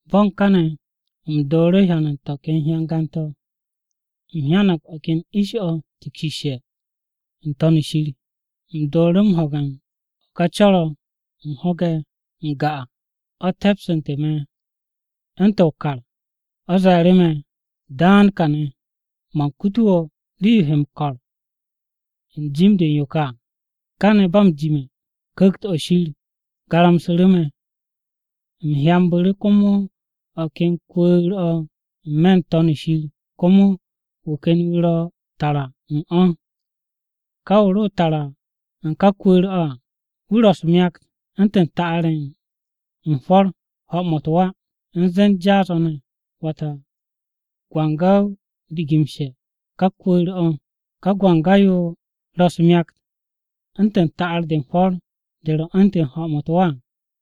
Bo̱n kane̱, u̱m dooru̱ hyan u̱n to̱ ken hyangan-to̱, u̱m hyang o̱ ken ish-o̱ tikshisse̱ n-To̱n shir. U̱m dooru̱ m-ho̱ge̱ u̱n ká co̱r-o̱ u̱m ho̱ge̱ n-ga à. O̱ te̱psu̱tu̱ me̱ u̱ntu̱n o-kar o̱ ze̱e̱ru̱ me̱, “Daan kane̱, man kutu wo̱ rii-yo he m-ko̱r u̱n jim-de u̱n yo ka à.” Kane̱ ba m-jime̱, Ku̱kt-o̱ Shir garamsu̱ru̱ me̱, u̱m hyanbu̱ru̱ komo o̱ ken kwu̱u̱r-o̱ n-me̱ n-To̱n shir komo wu̱ ken wu̱ ro tara u̱n o̱. Ka wu̱ ro tara u̱n ka kwu̱u̱r-o̱ à wu̱ ro̱ u̱s-myakt u̱ntu̱n ta'ar-ye̱ u̱n hwo̱r-ye̱ u̱n ho̱-mo̱ u̱t-wa u̱n zen jaas-o̱ ne̱. Wata, gwanga-o rigimshe̱ ka kwu̱u̱r-o̱. Ka gwanga-yo ro u̱s-myakt u̱ntu̱n ta'ar-de u̱n hwo̱r de ro̱ u̱ntu̱n ho̱-mo̱ u̱t-wa à.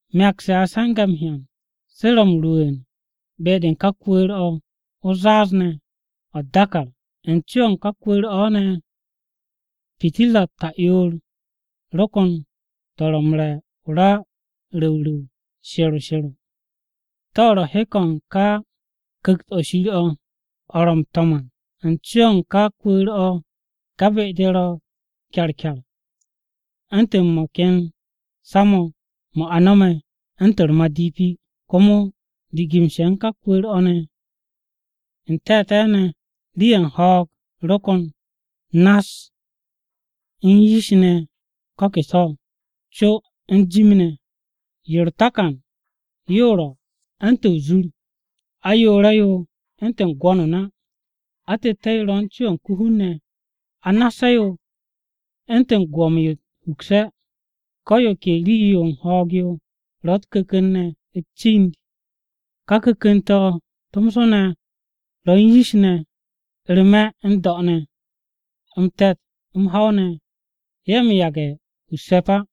Myakt-se a se̱nge̱ m-hyan se ro̱ m-rwu̱u̱n be-de u̱n ka kwu̱u̱r-o̱ o-zaaz ne̱ o̱ u̱t-dàkàr. U̱n co-o̱ u̱n ka kwu̱u̱r-o̱ ne̱, pitirra-u̱t ta'yoor ro̱ ko̱n to̱ ro̱ m-re̱ o-ra ru̱wru̱w she̱ro she̱ro, to̱ ro̱ hek-o̱ u̱n Ku̱kt-o̱ Shir, to̱ Shir ro̱ m-to̱m à. U̱n co-o̱ u̱n ka kwu̱u̱r-o̱, ka be-de ro kyarkyar u̱ntu̱n mo̱ ken sa-mo̱ mo̱ a no̱me̱ u̱ntu̱n u̱r-madipi à. Komo rigimshe̱ u̱n ka kwu̱u̱r-o̱ ne̱, n-te̱te̱ ne̱ rii-ye̱ u̱n ho̱o̱g ro kon nass u̱n yish ne̱ ko̱ ke so̱, co u̱n jim ne̱. Yo u̱r-takan ya yo ro̱ u̱ntu̱n o-zur, ayoore̱-yo u̱ntu̱n gwo̱n o-na, atette̱-yo ro̱ u̱n co-o̱ u̱n ko-hun ne̱, anasse̱-yo u̱ntu̱n o-gwo̱m yo u̱t-hukse̱. Ko̱ yo ke rii-yo u̱n ho̱o̱g-yo ro̱ u̱t-ku̱ku̱n ne̱ u̱t-cind, ká ku̱ku̱n-to̱ tomso ne̱ ro̱ u̱n yish ne̱ u̱r-me̱ n-do̱ ne̱. M-te̱t, m-ho̱w ne̱, ye̱ m-yage̱ hu u̱s-se̱p á: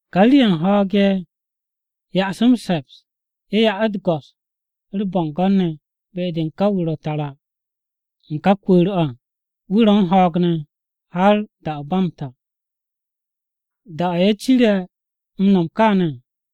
Ka rii-ye̱ u̱n ho̱o̱g-ye̱ u̱n ya'as m-se̱ps, ya u̱t-go̱s, u̱r-bo̱ngo̱n ne̱ be-de u̱n ka wu̱ ro tara u̱n ká kwu̱u̱r-o̱ à, wu̱ ro̱ u̱n ho̱o̱g ne̱ har da-o̱ ba m-ta à. Da-o̱ ye̱ cire̱ no̱m kaane̱ à,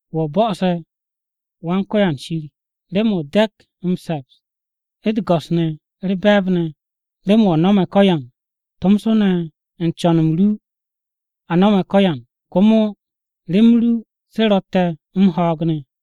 “Wo̱ bo̱'o̱se̱, Wan-Ko̱yan Shir, remen o dekt m-se̱ps, u̱t-go̱s, u̱r-be̱e̱b ne̱. Remen wo̱ no̱me̱ ko̱yan, tomso ne̱ u̱n co̱n-m ru o̱ a no̱me̱ ko̱yan komo remen ru, se ro̱tte̱ m-ho̱o̱g ne̱.”